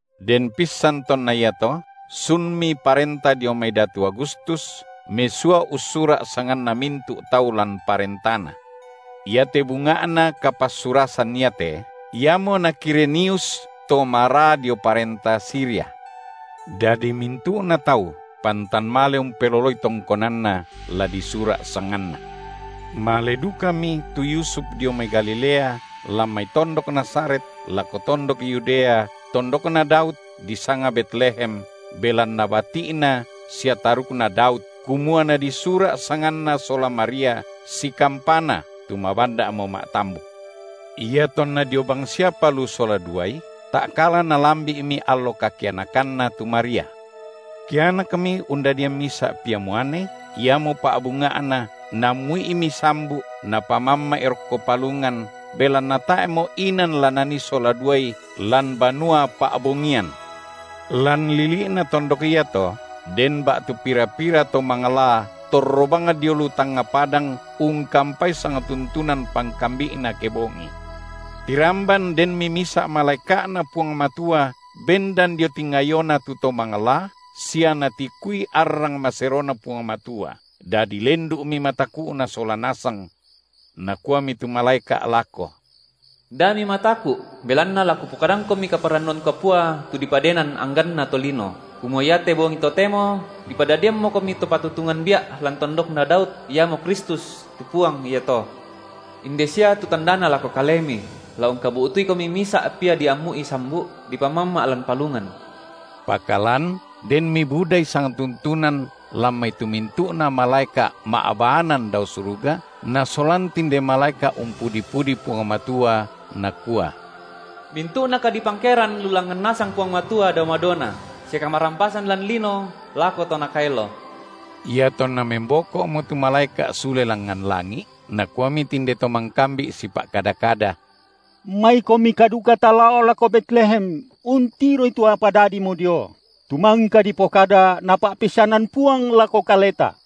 Den pissan tonna iato, sunmi parenta dio mai datu Agustus mesua ussura’ sanganna mintu’ tau lan parentana. Iate bunga’na kapassurasan iate iamo na Kirenius to maraa dio parenta Siria. Dadi mintu’na tau pantan male umpeloloi tongkonanna, la disura’ sanganna. Male dukami tu Yusuf dio mai Galilea, lan mai tondok Nazaret, lako tondok Yudea, tondokna Daud, disanga Betlehem, belanna bati’na sia tarukna Daud, kumua nadisura’ sanganna sola Maria, sikampana, tu mabanda’mo ma’tambuk. Iatonna dio bangsiapa lu sola duai, ta’kala nalambi’mi allo kakianakanna tu Maria. Kianakmi, undadian misa’ Pia muane, iamo pa’bunga’na, naammu’Imi sambu’, napamamma’I rokko palungan, belanna tae’mo inan la nanii sola duai lan banua pa’bongian. Lan lili’na tondok iato den ba’tu pira-pira to manglaa torro bang dio lu tangnga padang ungkampai sangtuntunan pangkambi’na kebongi. Tiramban denmi misa’ malaeka’Na Puang Matua bendan dio tingayona tu to manglaa sia natikui arrang maseroNa Puang Matua, dadi lendu’mi mataku’na sola nasang. Nakuami tu malaeka’ lako: Da mimataku’, belanna la kupokadangkomi kaparannuan kapua tu dipadenan angganna tolino, kumua iate bongi totemo dipadadiammokomi To patutungan bia’ lan tondokna Daud, iamo Kristus, tu Puang iato. Inde sia tu tandana lako kalemi: la ungkabu’tuikomi misa’ Pia diammu’I sambu’, dipamamma’ lan palungan. Pakalan denmi budai sangtuntunan lan mai tu mintu’na malaeka’ ma’baanan dao suruga nasolan tinde malaeka’ umpudi-pudi Puang Matua, nakua: Mintu’na kadipangkeran lu langngan nasang Puang Matua dao madona, sia kamarampasan lan lino lako to Nakaelo. Iatonna memboko’mo tu malaeka’ sule langngan langi’, nakuami tinde to mangkambi’ sipa’kada-kada: Maikomika duka talao lako Betlehem, untiroi tu apa dadimo dio, tu mangka dipokada, Napa’peissanan Puang lako kaleta.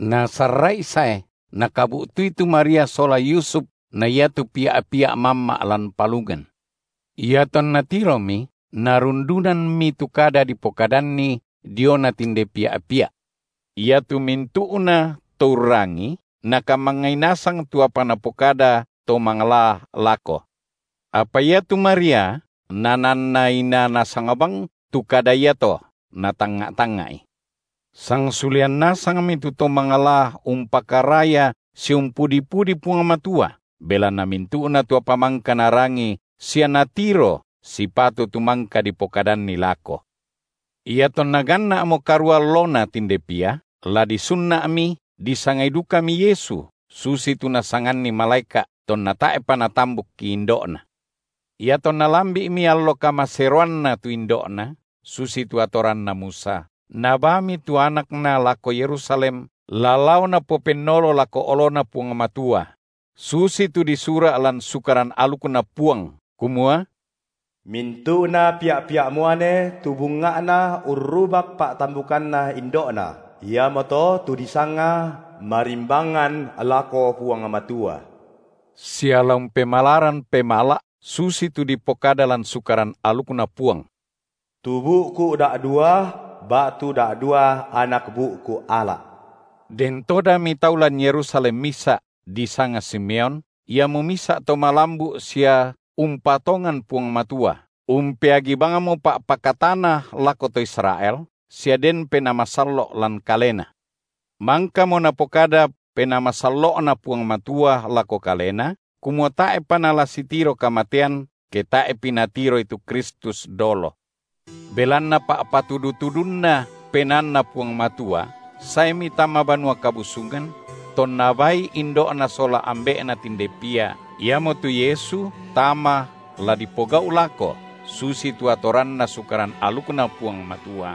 Nasarra’i sae, nakabu’tui tu Maria sola Yusuf na iatu Pia’-Pia’ mamma’ lan palungan. Iatonna tiromi, narundunammi tu kada dipokadanni diona tinde Pia’-Pia’. Iatu mintu’nato urrangii, nakamangngai nasang tu apa napokada to manglaa lako. Apa iatu Maria nananna inaa nasang bang tu kada iato, natangnga’- tangnga’i. Sangsulean nasangmi tu to manglaa umpakaraya sia umpudi-pudi Puang Matua, belanna mintu’na tu apa mangka narangi sia natiro sipatu tu mangka dipokadanni lako. Iatonna ganna’mo karua allona tinde Pia, la disunna’mi, disangai dukami Yesu, susitu nasanganni malaeka’, tonna tae’pa natambukki indo’na. Iatonna lambi’mi allo kamaseroanna tu indo’Na, susitu atoranna Musa, nabaami tu anakna lako Yerusalem, la lao napopennolo lako oloNa Puang Matua; susitu disura’ lan Sukaran alukNa Puang, kumua: Mintu’na pia’-pia’ muane tu bunga’na urrubak pa’tambukanna indo’na, iamoto tu disanga marimbangan lako Puang Matua, sia la umpemalaran pemala’, susitu dipokada lan Sukaran alukNa Puang: tu bu’ku’ da’dua ba’tu da’dua anak bu’ku’ ala’. Den todami tau lan Yerusalem misa’, disanga Simeon, iamo misa’ to malambu’ sia umpatongan Puang Matua, umpeagi bangmo pa’pakatana lako to Israel sia den Penaa Masallo’ lan kalena. Mangkamo napokada Penaa Masallo’Na Puang Matua lako kalena, kumua tae’pa nala sitiro kamatean, ke tae’pi natiroi tu Kristus dolo. Belanna pa’patudu-tudunNa PenaanNa Puang Matua saemi tama Banua Kabusungan; tonna baaI indo’Na sola ambe’Na tinde Pia, iamotu Yesu, tama, la dipogau’ lako, susitu atoranna Sukaran alukNa Puang Matua,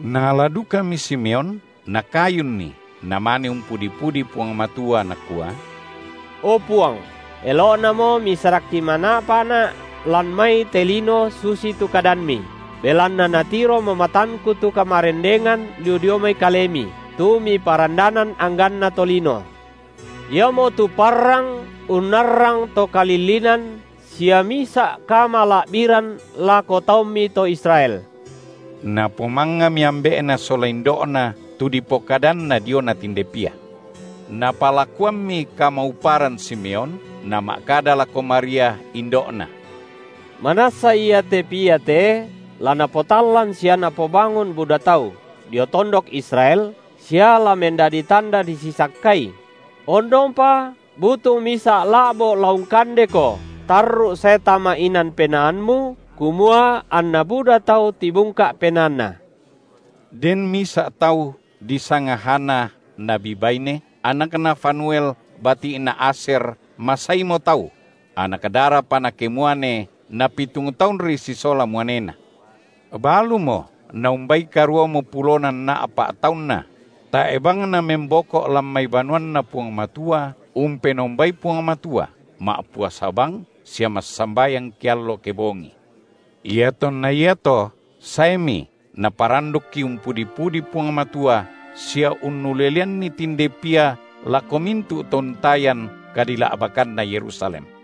naala dukami Simeon, nakayunNi, namane umpudi-pudi Puang Matua nakua: O! Puang, elo’namo Misarakki mana’pana’ lan mai te lino, susitu kadamMi, belanna natiromo matangku tu kamarendengan lu dio mai Kalemi, tu Miparandanan angganna tolino. Iamotu parrang unnarrang to kalillinan sia misa’ kamala’biran lako taumMi to Israel. Napomangngami ambe’Na sola indo’Na tu dipokadanna diona tinde Pia. Napalakuammi kamauparan Simeon, nama’kada lako Maria, indo’Na: Manassa iate Pia te la napotallan sia napobangun buda tau dio tondok Israel sia la mendadi tanda disisakkai; ondongpa butung misa’ la’bo’ la ungkandeko tarru’ sae tama inan penaammu kumua, anna buda tau tibungka’ penaanna. Den misa’ tau, disanga Hana, nabi baine, anakna Fanuel, bati’na Asyer, masaimo tau; anak darapa nakemuane napitung taunri sisola muanena; balumo na umbai karuamo pulona nna’pa’ taunna; tae’ bang namemboko’ lan mai banuanNa Puang Matua umpenombai Puang Matua, ma’puasa bang sia massambayang keallo kebongi. Iatonna iato saemi, naparandukki umpudi-pudi Puang Matua sia unnuleleanni tinde Pia lako mintu’ to untayan kadila’bakanna Yerusalem.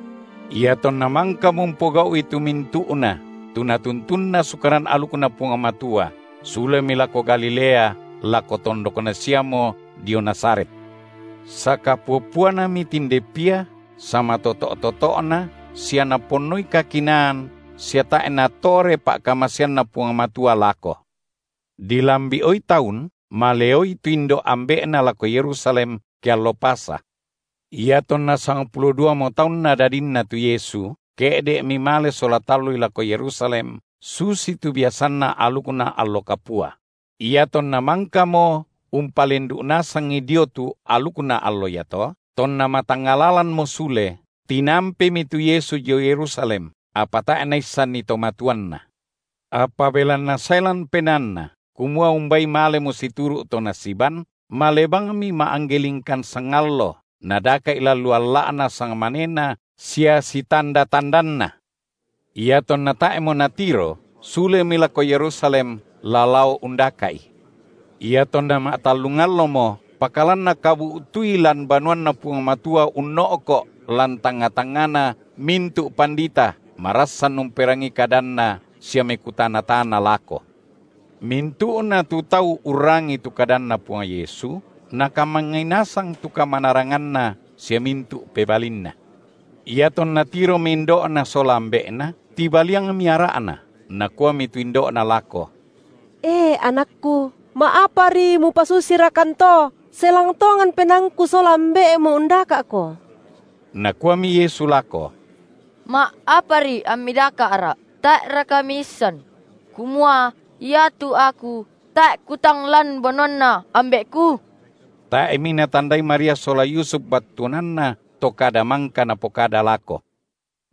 Iatonna mangkamo umpogau’i tu mintu’na tu natuntunna Sukaran alukNa Puang Matua, sulemi lako Galilea, lako tondokna siamo dio Nazaret. Sakapua-puanami tinde Pia samatoto’-toto’Na sia Naponnoi kakinaan sia tae’ natore pa’kamaseanNa Puang Matua lako. Dilambi’oi taun maleoi tu indo’ ambe’Na lako Yerusalem, ke allo Pasa. Iatonna sangpulo duamo taunna dadinNa tu Yesu, ke’de’mi male sola tallui lako Yerusalem, susitu biasanna alukna allo kapua; iatonna mangkamo umpalendu’ nasangi dio tu alukna allo iato, tonna matangnga lalanmo sule, tinampemi tu Yesu dio Yerusalem, apa tae’ naissanni to matuanNa. Apa belanna sae lan penaanna, kumua umbai malemo situru’ to nasiban, male bangmi ma’angge lingkan sangallo, nadaka’i lan lu alla’na sangmanena sia sitanda-tandanna. Iatonna tae’mo natiro, sulemi lako Yerusalem, la lao undaka’I. Iatonna ma’tallung allomo, pakalan nakabu’tuI lan banuanNa Puang Matua unno’ko’ lan tangnga-tangngana mintu’ pandita, marassan umperangii kadanna sia mekutana-tana lako. Mintu’na tu tau urrangii tu kadanNa Puang Yesu, nakamangngai nasang tu kamanaranganNa sia mintu’ pebalinNa. Iatonna tiromi indo’Na sola ambe’Na, tibaliangmi ara’na, nakuami tu indo’Na lako: E anakku, ma’apari Mupasusirakan to? Selang tongan penaangku sola ambe’Mu undaka’Ko. Nakuami Yesu lako: Ma’apari ammi daka’Ra’? Tae’raka miisan, kumua iatu Aku tae’ Kutang lan banuanNa Ambe’Ku? Tae’mi natandai Maria sola Yusuf battuananna to kada mangka Napokada lako.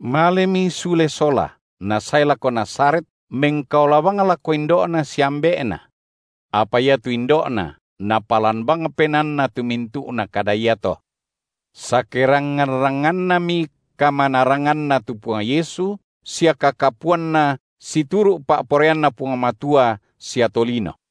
Malemi sule sola, Nasae lako Nazaret, mengkaola bang lako indo’Na sia ambe’Na. Apa iatu indo’Na napalan bang penaanna tu mintu’na kada iato. Sakerangngan-rangngannami kamanaranganNa tu Puang Yesu sia kakapuanNa situru’ pa’poraianNa Puang Matua sia tolino.